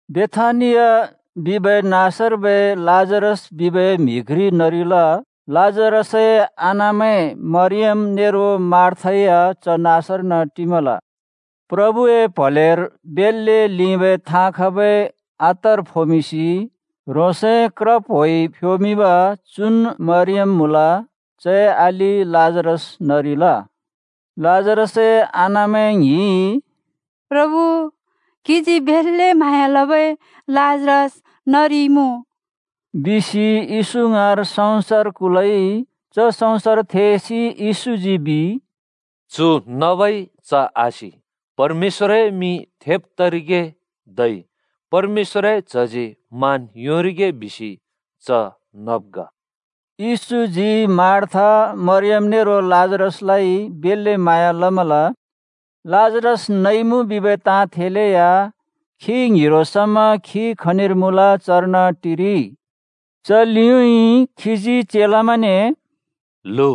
बेथानिया बिबै नाँसर्बै लाजरस बिबै म्हि घ्रि नरिल। लाजरसए आनामैं मरियाम नेरो मार्था या च नाँसर्न टिमल। प्रभुए प्हलेर बेल्‍ले लिंबै थाँ खबै अत्तर फोमिंसि ह्रोंसए क्र प्होइ फ्योमिंब चुन् मरियम मुँल। चए अलि लाजरस नरिल। लाजरसए आनामैं ङ्हिंइ “प्रभु, क्‍हिजी बेल्‍ले म्हाँया लबै लाजरस नरिइमुँ” बिसि येशू ङाँर सँउँसर कुलइ। च सँउँसर थेसि येशूजी बिइ, “चु नबइ च आसि। परमेश्‍वरए मिं थेब तरिगे धै परमेश्‍वरए च्हजी मान योंरिगे बिसि च नब् ग।” येशूजी मार्था, मरियम नेरो लाजरसलाइ बेल्‍ले म्हाँया लमल। लाजरस नइमुँ बिबै ताँ थेलेया खी ङ्हिरो समा खी खनिर मुँल चर्न टिरिइ। च लिउँइँ खीजी चेलामैंने “ल्हु,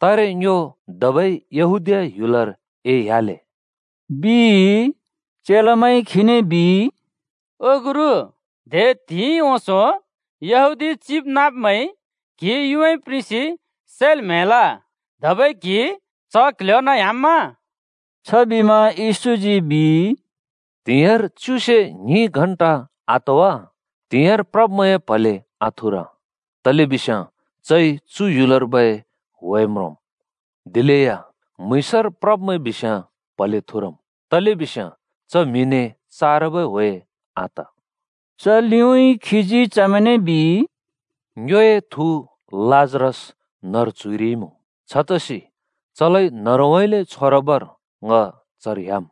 तारे ङ्यो धबै यहूदीया ह्‍युलर एह्‍याले,” बिइ। चेलामैंइ खीने बिइ, “ओ गुरु, दे त्हिंइ ओंसों यहूदी चिबनाँब्मैंइ क्हि युँमाइ प्रिंसि सैल् म्‍हैल! धबै क्‍हि च क्‍ल्‍ह्‍योर्न ह्‍याम्‍मा?” छबिमा येशूजी बिइ, “त्‍हिंयाँर च्युसे ङ्हिं घण्टा आत वा? त्‍हिंयाँर प्रब्मैंए प्हले आथुर। तलेबिस्याँ चइ चु ह्‍युलर्बै ह्‍वे म्रोंम्। दिलेया म्‍हुँइँसर प्रब्मैं बिस्याँ प्हले थुरम्। तलेबिस्याँ च म्हिने चारबै ह्‍वे आत।” च लिउँइँ खीजी चमैंने बिइ, “ङ्योए थु लाजरस न्‍हरु च्‍हुइरिमुँ। छतसि चलाइ न्हरुउँइँले छोरबर ङ चर ह्‍याम्।”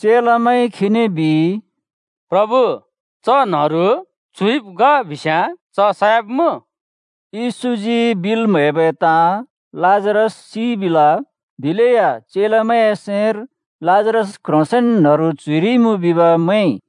चेलामैंइ खीने बिइ, “प्रभु, च न्‍हरु च्‍हुइब् ग बिस्‍याँ च सयाब्मुँ।” येशूजी बिल् म्हैबै ताँ लाजरस सिइ बिल। दिलेया चेलामैंए सैंर लाजरस क्‍ह्रोंसेंन न्‍हरु च्‍हुइरिमुँ बिब् मैंइ।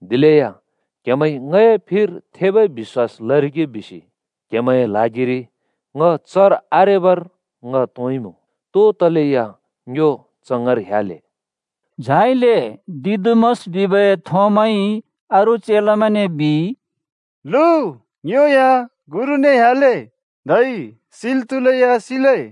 दिलेया क्हेमैंइ ङए फिर थेबै बिश्‍वास लरिगे बिसि क्हेमैंए ल्हागिरि ङ चर आरेबर ङ तोंइँमुँ। तो तलेया ङ्यो च ङाँर ह्‍याले।” झाइले दिदुमस बिबै थोमाइ अरू चेलामैंने बिइ, “ल्हु, ङ्यो या गुरुने ह्‍याले धै सिल् त्हुलेया सिले।”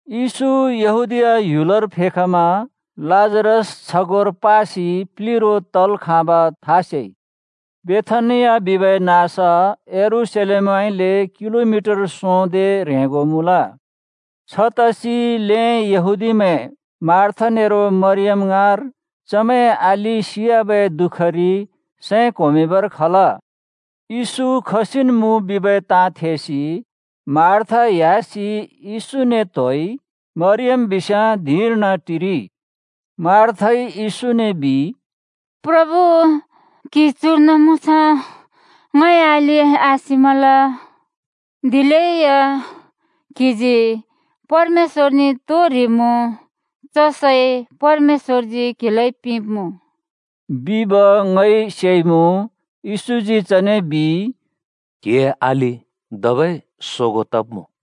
येशू यहूदीया ह्‍युलर फेखमा लाजरस छगोंर पासि प्‍लिरो तल् खाँबा था सेइ। बेथानिया बिबै नाँस यरूशलेमउँइँले किलोमिटर सोंदे ह्रेंगो मुँल। छतसि ल्‍हें यहूदीमैं मार्था नेरो मरियम ङाँर चमैंए अलि सियाबै दुःखरि सैं क्‍होमिंबर खल। येशू खसिन् मुँ बिबै ताँ थेसि मार्था ह्‍यासि येशूने त्‍होइ। मरियम बिस्याँ धिंर्न टिरिइ। मार्थाइ येशूने बिइ, “प्रभु, क्‍हि चुर्न मुँस्‍याँ ङए अलि आसिमल। दिलेया क्‍हिजी परमेश्‍वरने तो ह्रिमुँ, च सै परमेश्‍वरजी क्हिलाइ पिंब्मुँ,” बिब ङइ सेइमुँ। येशूजी चने बिइ, “क्‍हिए अलि धबै सोगों तब्मुँ।”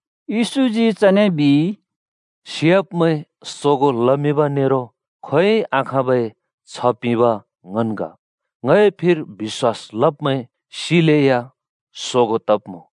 येशूजी चने बिइ, “सियाब्‍मैं सोगों लमिंब नेरो खोंयोंइ आखाँबै छ्ह पिंब ङन् ग। ङए फिर बिश्‍वास लब्‍मैं सिलेया सोगों तब्‍मुँ।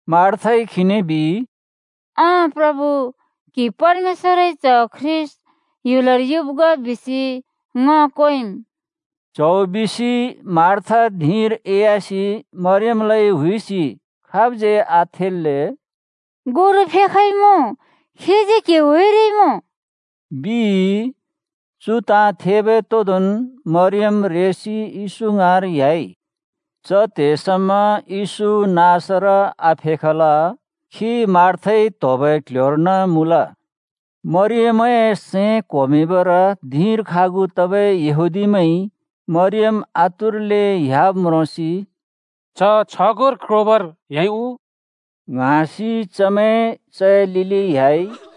मार्थाइ खीने बिइ, “अँ प्रभु, क्‍हि परमेश्‍वरए च्ह ख्रीष्‍ट ह्‍युलर युब् ग बिसि ङ क्वेंम्।” च्‍हौ बिसि मार्था धिंर एह्‍यासि मरियमलाइ हुइसि खाबज्यै आथल्‍ले “गुरु फेखइमुँ, खीजी क्हि हुइरिमुँ,” बिइ। चु ताँ थेबै तोदोंन् मरियम रेसि येशू ङाँर ह्‍याइ। च त्हे समा येशू नाँसर आफेखल। खी मार्थाइ त्होबै क्ल्ह्‍योर्न मुँल। मरियमए सैं क्‍होमिंबर धिंर खागु तबै यहूदीमैंइ मरियम आतुरले ह्‍याब् म्रोंसि, “च छगोंर क्रोबर ह्‍याइ उ?” ङ्हाँसि चमैं चए लिलि ह्‍याइ।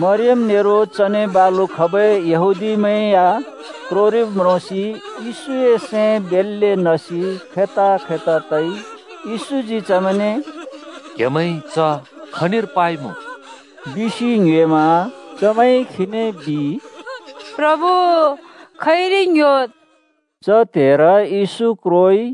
मरियम नेरो चने बालु खबै यहूदीमैं या क्रोरिब् म्रोंसि येशूए सैं बेल्‍ले नसि खैता-खैता तइ। येशूजी चमैंने “क्‍हेमैंइ च खनिर पाइमुँ?” बिसि ङ्योएमा। चमैंइ खीने “प्रभु, खइरि ङ्‌ह्‍योद्,” बिइ। च त्हेर येशू क्रोइ।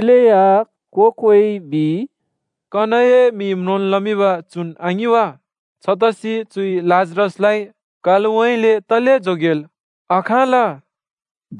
दिलेया को-कोइ, “कनए मि म्रोंल् लमिंब चुन् आङिं वा? छतसि चुइ लाजरसलाइ कालउँइँले तले जोगेल् आखाँल?” बिइ।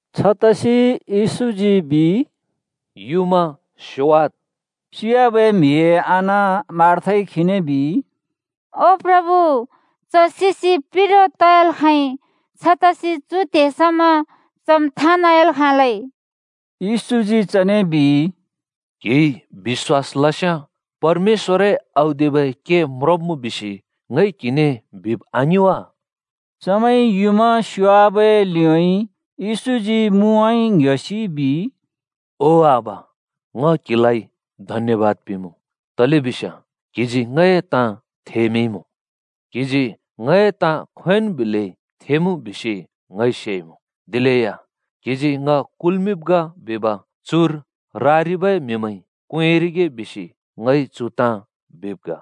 छतसि येशूजी “युँमा स्योयाद् बिमा।” सियाबै म्हिए आना मार्थाइ खीने बिइ, “ओ प्रभु, च सिसि प्लिरो तयाल् खाँइ। छतसि चु त्हे समा चम् थाँ नाँयाल् खाँलै।” येशूजी चने बिइ, “क्हिइ बिश्‍वास लस्याँ परमेश्‍वरए औदिबै के म्रोंब्‍मुँ बिसि ङइ क्हिने बिब् आङिं वा?” चमैंइ युँमा स्‍योवाबै लिउँइँ येशूजी मुउँइँ ङ्‌ह्‍योसि बिइ, “ओ आबा, ङ क्हिलाइ धन्यबाद पिंमुँ, तलेबिस्याँ क्‍हिजी ङए ताँ थेमिंइँमुँ। क्हिजी ङए ताँ खोंयोंन् बिलै थेमुँ बिसि ङइ सेइमुँ। दिलेया क्हिजी ङ कुल्मिंब् ग बिब चुर रारिबै म्हिमैंइ क्वेंरिगे बिसि ङइ चु ताँ बिब् ग।”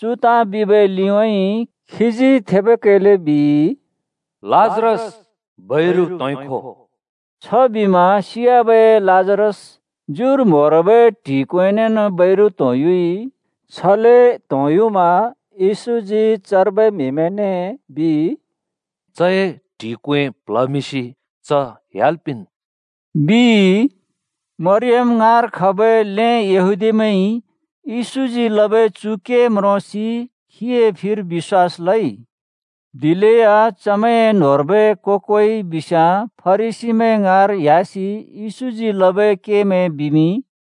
चु ताँ बिबै लिउँइँ खीजी थेबै कैले “लाजरस, बैरु त्होंइ खो बिसि ओरइ।” छबिमा सियाबै लाजरस ज्युर म्होरबै ट्हि क्वेंनेन् बैरु त्‍होंयुइ। छले त्होंयुमा येशूजी चर्बै म्हिमैंने “चए ट्हि क्वें प्ल्हमिंसि च ह्‍याल् पिंन्,” बिइ। मरियम ङाँर खबै ल्‍हें यहूदीमैंइ येशूजी लबै चु के म्रोंसि खीए फिर बिश्‍वास लइ। दिलेया चमैंए न्होंर्बै को-कोइ बिस्याँ फरिसीमैं ङाँर ह्‍‍यासि येशूजी लबै केमैं बिमिंइ।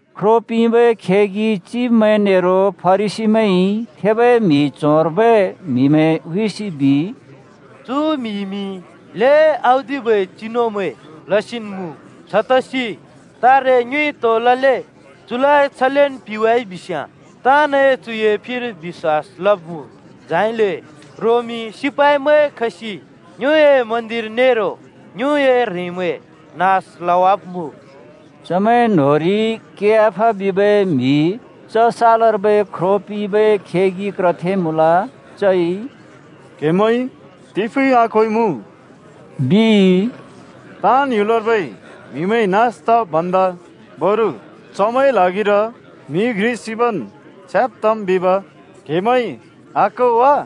ख्रो पिंबै खेगि चिब्मैं नेरो फरिसीमैंइ थेबै म्हि च्होंर्बै म्हिमैं हुइसि बिइ, “चु म्‍हिइमि ल्हें औदिबै चिनुमैं लसिन् मुँ। छतसि तारे ङ्योइ तो लले? चुलाइ छलेन् पिवाइ बिस्‍याँ ताँ‍नइ चुए फिर बिश्‍वास लब्मुँ, झाइले रोमी सिपाइमैं खसि ङ्योए मन्दिर नेरो ङ्योए ह्रेंमैं नास लवाब्मुँ।” चमैंए न्होंरि कैयाफा बिबै म्हि च सालर्बै ख्रो पिंबै खेगि क्रथे मुँल। चइ “क्‍हेमैंइ तिफुँइ आक्होइमुँ!” बिइ। “ताँन् ह्‍युलर्बै म्हिमैं नास तब् भन्दा बरु चमैंए ल्हागिर म्हि घ्रि सिबन् छ्याँब् तम् बिब क्हेमैंइ आक्हो वा?”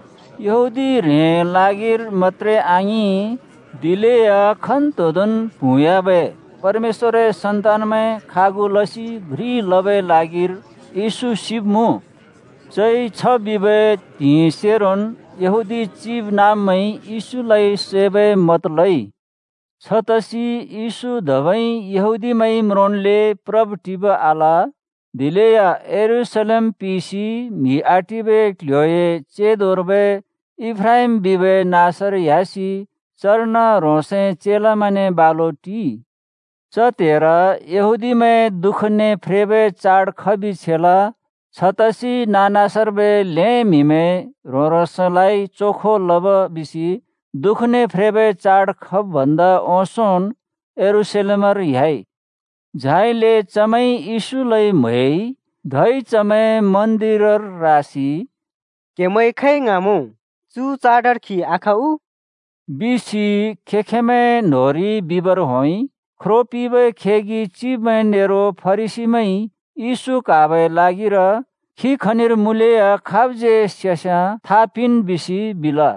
यहूदी ह्रेंए ल्हागिर मत्‍त्रे आङिं, दिलेया खन्तोंदोंन् प्हुँयाबै परमेश्‍वरए सन्तानमैं खागु लसि घ्रि लबै ल्हागिर येशू सिब्मुँ। चइ छ बिबै त्हिंइसेरोन् यहूदी चिबनाँब्मैंइ येशूलाइ सैबै मत लइ। छतसि येशू धबै यहूदीमैंइ म्रोंन्‍ले प्रब्-टिब आल। दिलेया यरूशलेम पिसि म्हि आटिबै क्ल्ह्‍योए चेंदोर्बै एफ्राइम बिबै नाँसर ह्‍यासि चर्न ह्रोंसए चेलामैंने बालु टिइ। च त्हेर यहूदीमैंए दुःखने फ्रेबै चाड खबि छेल। छतसि नाँ-नाँसर्बै ल्‍हें म्हिमैं ह्रों-ह्रोंसलाइ चोखो लब् बिसि दुःखने फ्रेबै चाड खब् भन्दा ओंसोंन् यरूशलेमर ह्‍याइ। झाइले चमैंइ येशूलाइ म्‍हैइ। धै चमैं मन्दिरर रासि “क्हेमैं खै ङ्हाँमुँ? चु चाडर खी आख उ?” बिसि खें-खेंमैं न्होंरि बिबर होंइ। ख्रो पिंबै खेगि चिब्मैं नेरो फरिसीमैंइ येशू क्हाबै ल्हागिर खी खनिर मुँलेया खाबज्यै सेस्याँ था पिंन् बिसि बिल।